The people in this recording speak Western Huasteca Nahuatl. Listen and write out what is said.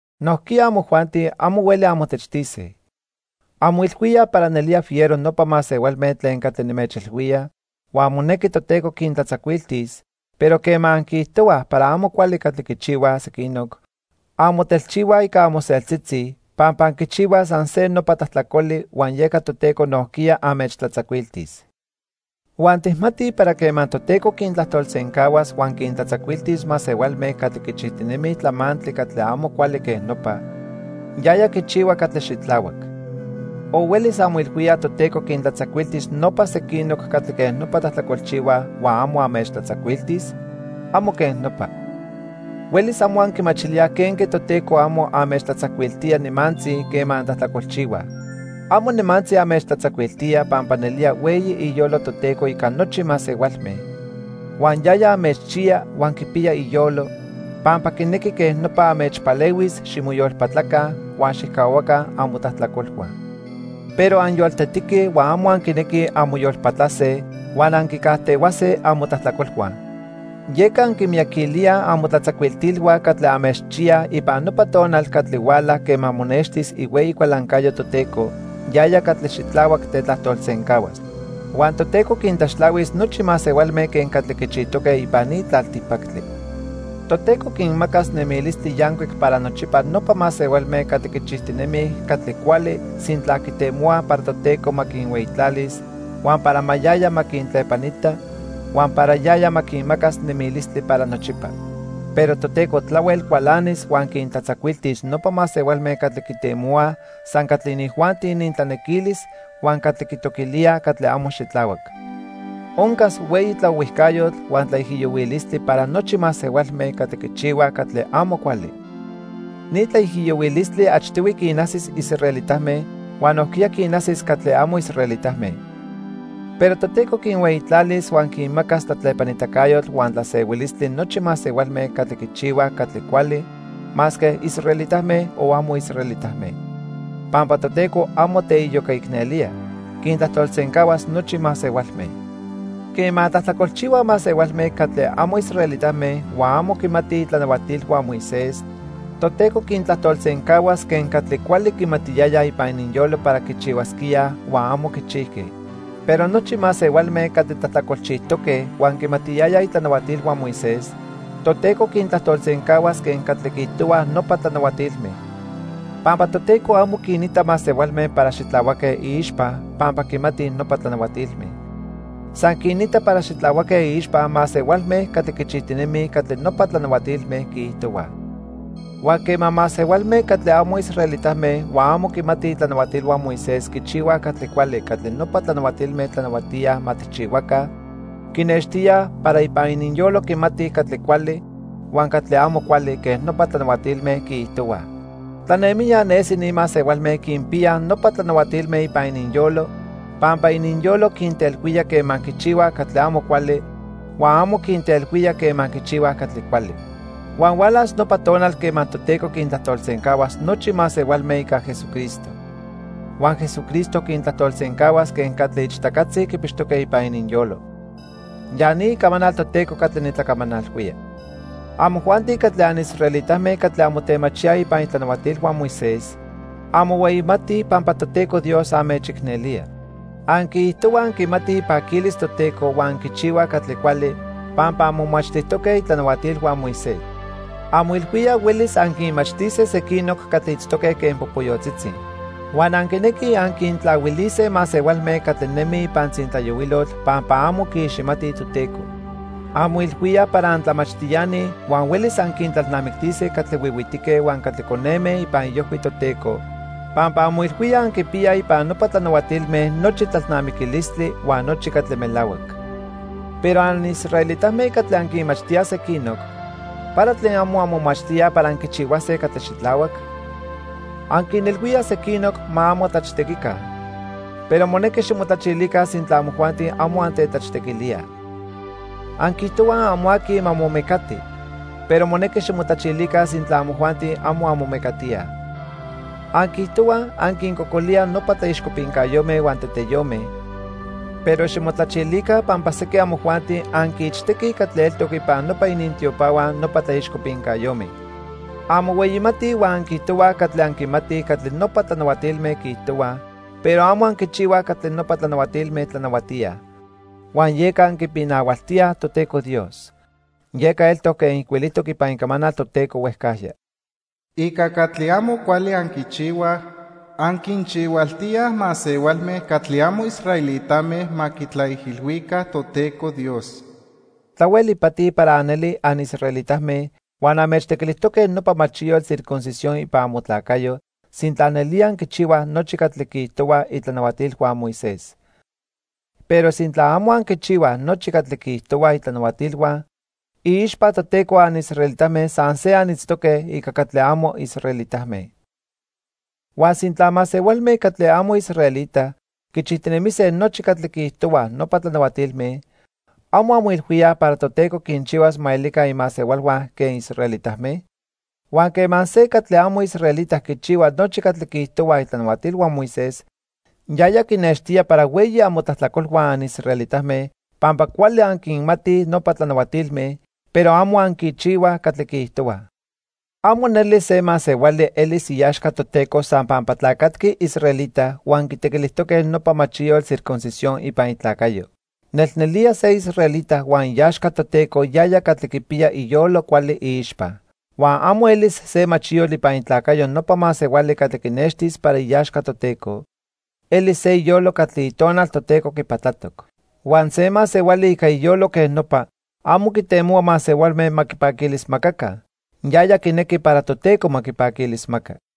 Nojquiya amojuanti amo hueli anmotechtise. Anmoilhuíaj para nelía fiero nopa masehualme tlen catli nimechilhuía, huan monequi Toteco quintlatzacuiltis, pero quema anquiijtohuaj para amo cuali catli quichihuaj sequinoc, anmotelchihuaj ica amoseltzitzi, pampa anquichihuaj san se nopa tlajtlacoli huan yeca Toteco nojquiya anmechtlatzacuiltis. Huan tijmatij para quema Toteco quintlajtolsencahuas huan quintlatzacuiltis masehualme catli quichijtinemij tlamantli catli amo cuali quen nopa, yaya quichihua catli xitlahuac. ¿O huelis anmoilhuíaj Toteco quintlatzacuiltis nopa sequinoc catli quej nopa tlajtlacolchihuaj huan amo anmechtlatzacuiltis? ¡Amo quen nopa! Huelis amo anquimachilíaj quenque Toteco amo anmechtlatzacuiltía nimantzi quema antlajtlacolchihuaj. Amo nimantzi anmechtlatzacuiltía pampa nelía hueyi iyolo Toteco ica nochi masehualme. Huan yaya anmechchiya huan quipiya iyolo, pampa quinequi quej nopa anmechpalehuis ximoyolpatlaca huan xijcahuaca amotlajtlacolhua. Pero anyoltetique huan amo anquinequij anmoyolpatlase huan anquicajtehuase amotlajtlacolhua. Yeca anquimiyaquilíaj amotlatzacuiltilhua catli anmechchiyaj ipan nopa tonal catli huala quema monextis ihueyi cualancayo Toteco, yaya catli xitlahuac tetlajtolsencahuas. Huan Toteco quintlaxtlahuis nochi masehualme quen catli quichijtoque ipan ni tlaltipactli. Toteco quinmacas nemilistli yancuic para nochipa nopa masehualme catli quichijtinemij catli cuali sintla quitemohuaj para Toteco ma quinhueyitlalis, huan para yaya ma quintlepanita, huan para yaya ma quinmacas nemilistli para nochipa. Pero Toteco tlahuel cualanis huan quintlatzacuiltis nopa masehualme catli quitemohuaj san catli inijuanti inintlanequilis huan catli quitoquilíaj catli amo xitlahuac. Oncas hueyi tlaohuijcayotl huan tlaijiyohuilistli para nochi masehualme catli quichihuaj catli amo cuali. Ni tlaijiyohuilistli achtihui quinajsis israelitame huan nojquiya quinajsis catli amo israelitame. Pero Toteco quinhueyitlalis huan quinmacas tlatlepanitacayotl huan tlasehuilistli nochi masehualme catli quichihuaj catli cuali, masque israelitame o amo israelitame. Pampa Toteco amo teiyocaicnelía, quintlajtolsencahuas nochi masehualme. Quema tlajtlacolchihuaj masehualme catli amo israelitame huan amo quimatij itlanahuatilhua Moisés, Toteco quintlajtolsencahuas quen catli cuali quimatiyayaj ipan ininyolo para quichihuasquíaj huan amo quichijque. Pero nochi masehualme catli tlajtlacolchijtoque huan quimatiyayaj itlanahuatilhua Moisés, Toteco quintlajtolsencahuas quen catli quiijtohuaj nopa tlanahuatilme. Pampa Toteco amo quinita masehualme para xitlahuaque iixpa pampa quimatij nopa tlanahuatilme. San quinita para xitlahuaque iixpa masehualme catli quichijtinemij catli nopa tlanahuatilme quiijtohuaj. Huan quema masehualme catli amo israelitame huan amo quimatij itlanahuatilhua Moisés quichihuaj catli cuali catli nopa tlanahuatilme tlanahuatíaj ma tijchihuaca quinextilíaj para ipan ininyolo quimatij catli cuali huan catli amo cuali quen nopa tlanahuatilme quiijtohuaj. Tlanemijya nesi ni masehualme quinpiyaj nopa tlanahuatilme ipan ininyolo pampa ininyolo quintelhuía quema quichihuaj catli amo cuali huan amo quintelhuía quema quichihuaj catli cuali. Huan hualas nopa tonal quema Toteco quintlajtolsencahuas nochi masehualme ica Jesucristo. Huan Jesucristo quintlajtolsencahuas quen catli ichtacatzi quipixtoque ipan ininyolo. Ya ni icamanal Toteco catli nitlacamanalhuía. Amojuanti catli anisraelitame catli anmotemachíaj ipan itlanahuatilhua Moisés, anmohueyimatij pampa Toteco Dios anmechicnelía. Anquiijtohuaj anquimatij ipaquilis Toteco huan anquichihuaj catli cuali pampa anmomachtijtoque itlanahuatilhua Moisés. Anmoilhuíaj huelis anquinmachtise sequinoc catli itztoque quen popoyotzitzi. Huan anquinequij anquintlahuilise masehualme catli nemij ipan tzintlayohuilotl pampa amo quiiximatij Toteco. Anmoilhuíaj para antlamachtiani huan huelis anquintlalnamictise catli huihuitique huan catli coneme ipan iojhui Toteco pampa anmoilhuíaj anquipiyaj ipan nopa tlanahuatilme nochi tlalnamiquilistli huan nochi catli melahuac. Pero anisraelitame catli anquinmachtíaj sequinoc, ¿para tlen amo anmomachtíaj para anquichihuase catli xitlahuac? Anquinilhuíaj sequinoc ma amo tlachtequica, pero monequi ximotlachilica sintla amojuanti amo antetlachtequilíaj. Anquiijtohuaj amo aqui ma momecati, pero monequi ximotlachilica sintla amojuanti amo anmomecatíaj. Anquiijtohuaj anquincocolíaj nopa tlaixcopincayome huan teteyome, pero ximotlachilica pampa sequin amojuanti anquiichtequij catli eltoc ipan nopa inintiopahua nopa tlaixcopincayome. Anmohueyimatij huan anquiijtohuaj cuali anquimatij catli nopa tlanahuatilme quiijtohuaj, pero amo anquichihuaj catli nopa tlanahuatilme tlanahuatíaj. Huan yeca anquipinahualtíaj Toteco Dios. Yeca eltoc quen ijcuilijtoc ipan Icamanal Toteco huejcajya: "Ica catli amo cuali anquinchihuaj, anquinchihualtíaj masehualme catli amo israelitame ma quitlaijilhuica Toteco Dios." Tlahuel ipati para anelij anisraelitame huan anmechtequilijtoque nopa machiyotl circuncisión ipan amotlacayo sintla nelía anquichihuaj nochi catli quiijtohuaj itlanahuatilhua Moisés. Pero sintla amo anquichihuaj nochi catli quiijtohuaj itlanahuatilhua, iixpa Toteco anisraelitame san se anitztoque ica catli amo israelitame. Huan sintla masehualme catli amo israelita quichijtinemise nochi catli quiijtohuaj nopa tlanahuatilme, ¿amo anmoilhuíaj para Toteco quinchihuas ma elica imasehualhua quen israelitame? Huan quema se catli amo israelita quichihua nochi catli quiijtohuaj itlanahuatilhua Moisés, yaya quinextía para hueyi amotlajtlacolhua anisraelitame pampa cuali anquinmatij nopa tlanahuatilme, pero amo anquichihuaj catli quiijtohuaj. Amo neli se masehuali elis iaxca Toteco san pampa tlacatqui israelita huan quitequilijtoque nopa machiyotl circuncisión ipan itlacayo. Nelnelía se israelita huan iaxca Toteco yaya catli quipiya iyolo cuali iixpa. Huan amo elis se machiyotl ipan itlacayo nopa masehuali catli quinextis para iaxca Toteco, elis se iyolo catli Itonal Toteco quipatlatoc. Huan se masehuali ica iyolo quej nopa amo quitemohua masehualme ma quipaquilismacaca, yaya quinequi para Toteco ma quipaquilismaca.